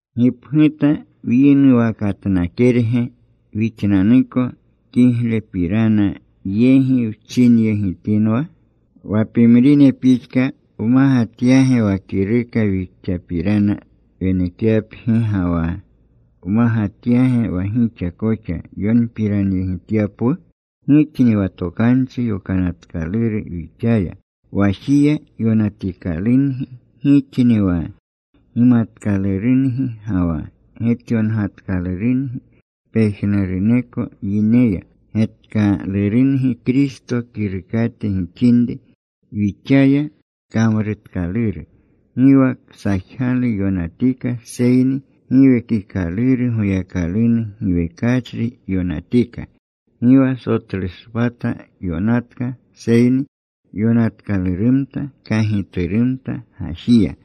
¿Gipguta wyinuwakatnakerge wixnanuko kiglepirana yegi wchinyegitinwa? ¿Wa pimrine pixka wmagatyage wa kiruka wixapirana wenekyapgi ga wa wmagatyage wa gixa koxa yonpiranyegityapwu? Gixni wa tokanchi yonatkaluru wixaya. Wajiya yonatikalungi. Gixni wa gimatkalurungi ga wa getyongatkalurungi pejnuruneko yineya. Getkalurungi Kristo kirukate gixinri, wixaya kamrutkaluru. Gi wa ksajgalu yonatika, seyni Giwekikaluru Goyakalunu giwekachri yonatika. Gi wa sotlushpata yonatka, seyni yonatkalurumta kagiturumta gajiya.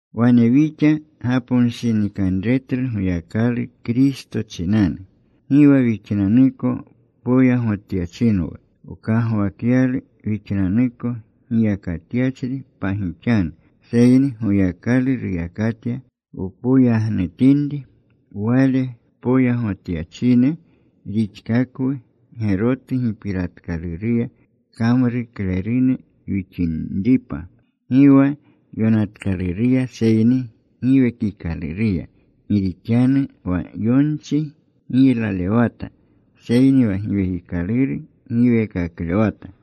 Wane wixa gaponshinikanretlu Goyakalu Kristo chinanu. Gi wa wixnanuko poyagotyachinwu, wkagwakyalu wixnanuko giyakatyachri pagixanu, seyni Goyakalu ruyakatya wpoyagotinri. Wale poyagotyachine rixkakwu, gerotu gipiratkaluruya kamruklerune wixinripa, gi wa yonatkaluruya seyni Giwekikaluruya. Gi rixanu wa yonchi giylalewata, seyni wa Giwekikaluru giweekaklewata.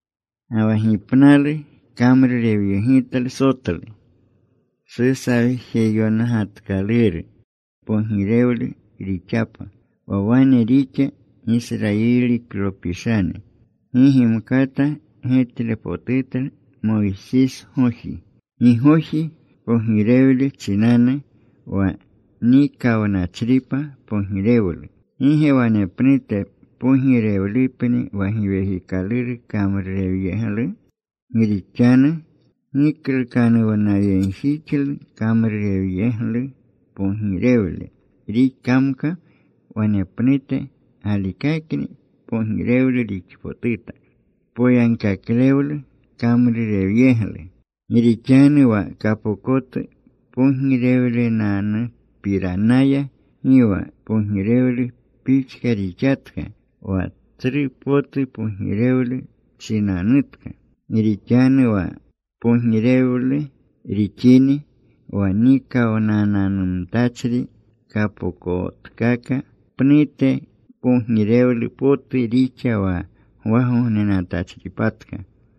Ga wa gipnalu kamrurewyeglu sotlu susawjeyongatkaluru pogirewlu rixapa. Wa wane rixa Gisrayilineklopishane gi gimkata getlepotutlu Moysisgoji, gigoji pogirewle chinanu, wa nikawnachripa pogirewlu. ¿Gi ge wanepnute pogirewlupni wa Giwekikaluru kamrurewyeglu? Gi rixanu giklukanuwnayegjixlu kamrurewyeglu pogirewlu rixkamka, wanepnute galikakni pogirewlu rixpotuta poyagkaklewlu kamrurewyeglu. Gi rixanu wa kapokotu pogirewlunanupiranaya gi wa pogirewlu pixka rixatka wa tsru potu pogirewlu chinanutka. Gi rixanu wa kpogirewle rixini wa nikawnananumtachri kapokotkaka, pnute kpogirewle potu rixa wa gwagognenatachripatka.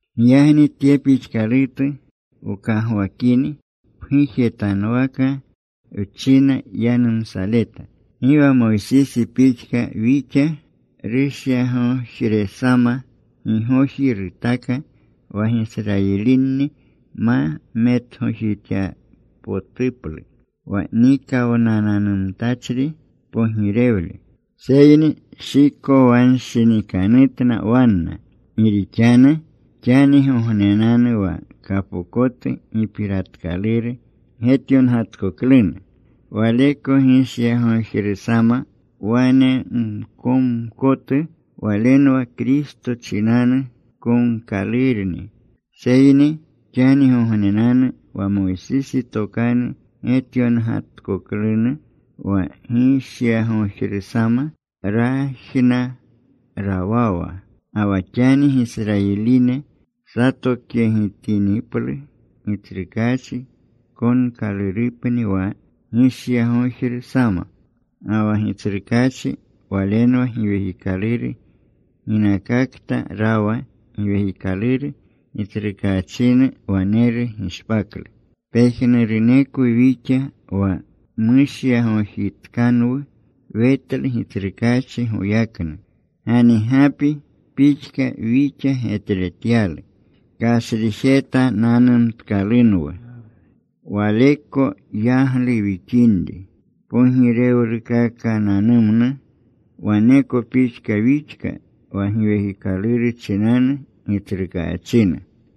Giyagni tye pixkalutu wkagwakini, pgujetanuwaka wchina yanumsaleta. Gi wa Moysisi pixka wixa. Rushyagojresama gigoji rutaka wa Gisrayilini ma metgojityanpotuplu wa nikawnananumtachri pogirewle. Seyni shikowanshinikanutna wanna. Gi rixanu xanigognenanu wa kapokotu gipiratkaluru getyongatkoklunu, waleko gishyagojrusama wane mkonkotu. Walenwa Kristo chinanu konkalurni. Seyni xanigognenanu wa Moysisi tokanu getyongatkoklunu wa gishyagojrusama rajna rawawa. Ga wa xani Gisrayiline satokyegitiniplu Gitsrukaachi, konkalurupni wa gishyagojru sama. Ga wa Gitsrukaachi Walenwa Giwekikaluru. Ginakakta rawa Giwekikaluru Gitsrukaachinu waneru gishpaklu. Pejnurunekwu wixa wa mushyagojitkanwu wetlu Gitsrukaachi goyaknu. Ganigapi pixka wixa getletyalu. Kashrijetananumtkalunwu Waleko yaglu wixinri pogirewlukakananumnu. Waneko pixka wixka wa Giwekikaluru chinanu Gitsrukaachinu.